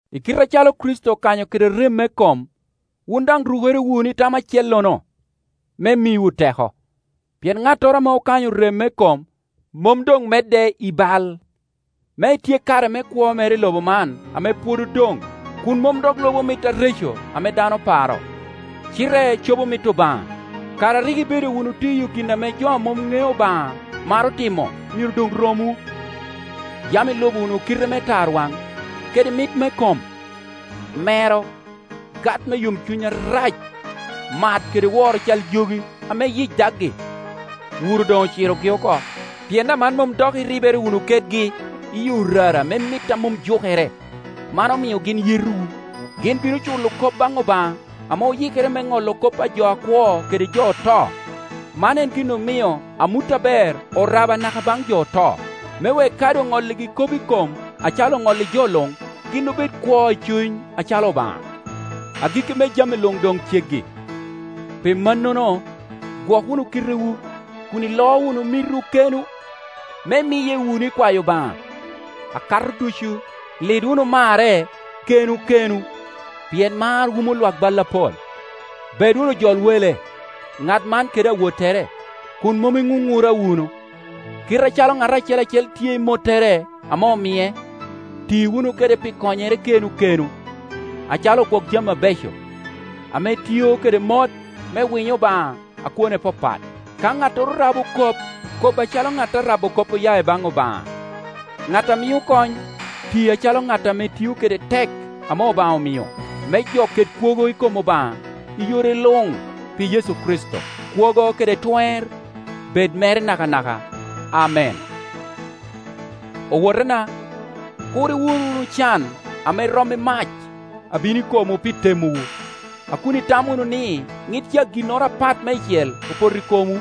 I kite acalo Kricito okanyo kede rem me kom, wun daŋ rukere wunu i tam acellono, me miwu teko. Pien ŋattoro ame okanyo rem me kom mom doŋ medde i bal, me etyek kare me kwo mere i lobo man ame pwod odoŋ kun mom dok lubo mit areco ame dano paro, cite cobo mit Obaŋa. Kare a rik ibedo wunu tiyo gin ame jo a mom ŋeo Obaŋa maro timo myero doŋ romwu. Yam ilubo wunu kite me tarwaŋ, kede mit me kom, mero, gat me yomcuny arac, mat kede woro cal jogi ame yic dagi. Wuro doŋ ocirogi oko, pien aman mom dok iribere wunu kedgi i orara me mit a mom jukere; man omio gin yetowu. Gin bino culo kop baŋ Obaŋa ame oyikere me ŋolo kop a jo akwo kede jo oto. Man en gin omio amut aber orabo anaka baŋ jo oto, me wek kadi oŋolligi kop i kom acalo oŋolli jo luŋ, gin obed kwo i cuny acalo Obaŋa. Agikki me jami luŋ doŋ ceggi; pi mannono, gwok wunu kitewu, kun iloo wunu mitwu kenwu, me imiye wunu i kwayo Obaŋa. Akato ducu, lid wunu marre kenwu kenwu; pien mar wumo Iwak bal apol. Bed wunu ojol wele, ŋat man kede awottere, kun mom iŋuŋura wunu. Kit acalo ŋat acel acel tye i mottere ame omie, ti wunu kede pi konyere kenwu kenwu, acalo ogwok-jami abeco, ame tiyo kede mot me winyo Obaŋa a kwone papat. Ka ŋattoro rabo kop, kob acalo ŋat a rabo kop oya i baŋ Obaŋa; ŋat a mio kony, ti acalo ŋat ame tio kede tek ame Obaŋa omio; me jo ket kwogo i kom Obaŋa i yore luŋ pi Yecu Kricito. Kwogo kede twer bedo mere nakanaka. Amen. Owotena, kur iwur wunu can ame rom i mac a bino i komwu pi temowu, a kun itamo wunu ni ŋit ca ginnoro apat meicel opoto i komwu.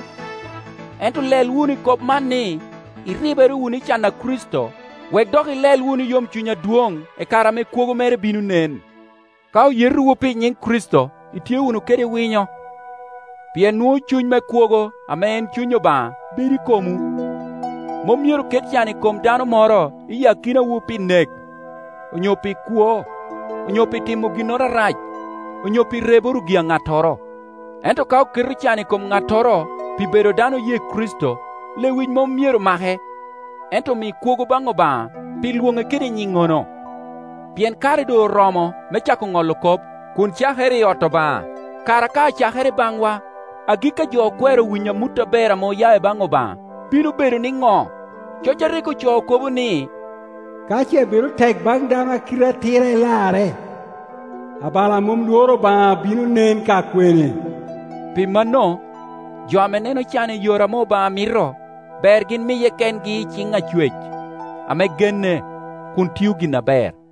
Ento lel wunu i kop man ni, iribere wunu i can a Kricito, wek dok ilel wunu i yomcuny adwoŋ i kare ame kwogo mere bino nen. Ka oyetowu pi nyiŋ Kricito, itye wunu kede winyo, pien nwoŋo cuny me kwogo ame en Cuny Obaŋa bedo i komwu. Mom myero ket can i kom dano moro i akinawu pi nek, onyo pi kwo, onyo pi timo ginnoro arac, onyo pi reboro gi-a ŋattoro. Ento ka oketo can i kom ŋattoro pi bedo dano oye Kricito, lewic mom myero make, ento omi kwogo baŋ Obaŋa pi lwoŋe kede nyinŋono. Pien kare doŋ oromo me cako ŋolo kop, kun cakere i ot Obaŋa. Kara ka acakere i baŋwa, agikki a jo okwero winyo amut aber ame oya i baŋ Obaŋa bino bedo niŋo? Coc a rik ocoo kobo ni, “Ka ce bedo tek baŋ dano a kite atira illarre, abalo a mom Iworo Obaŋa bino nen ka kwene?” Pi mano, jo ame neno can i yore ame Obaŋa mito, ber gin miye kengi i ciŋ Acwec ame genne, kun gin tio gin aber.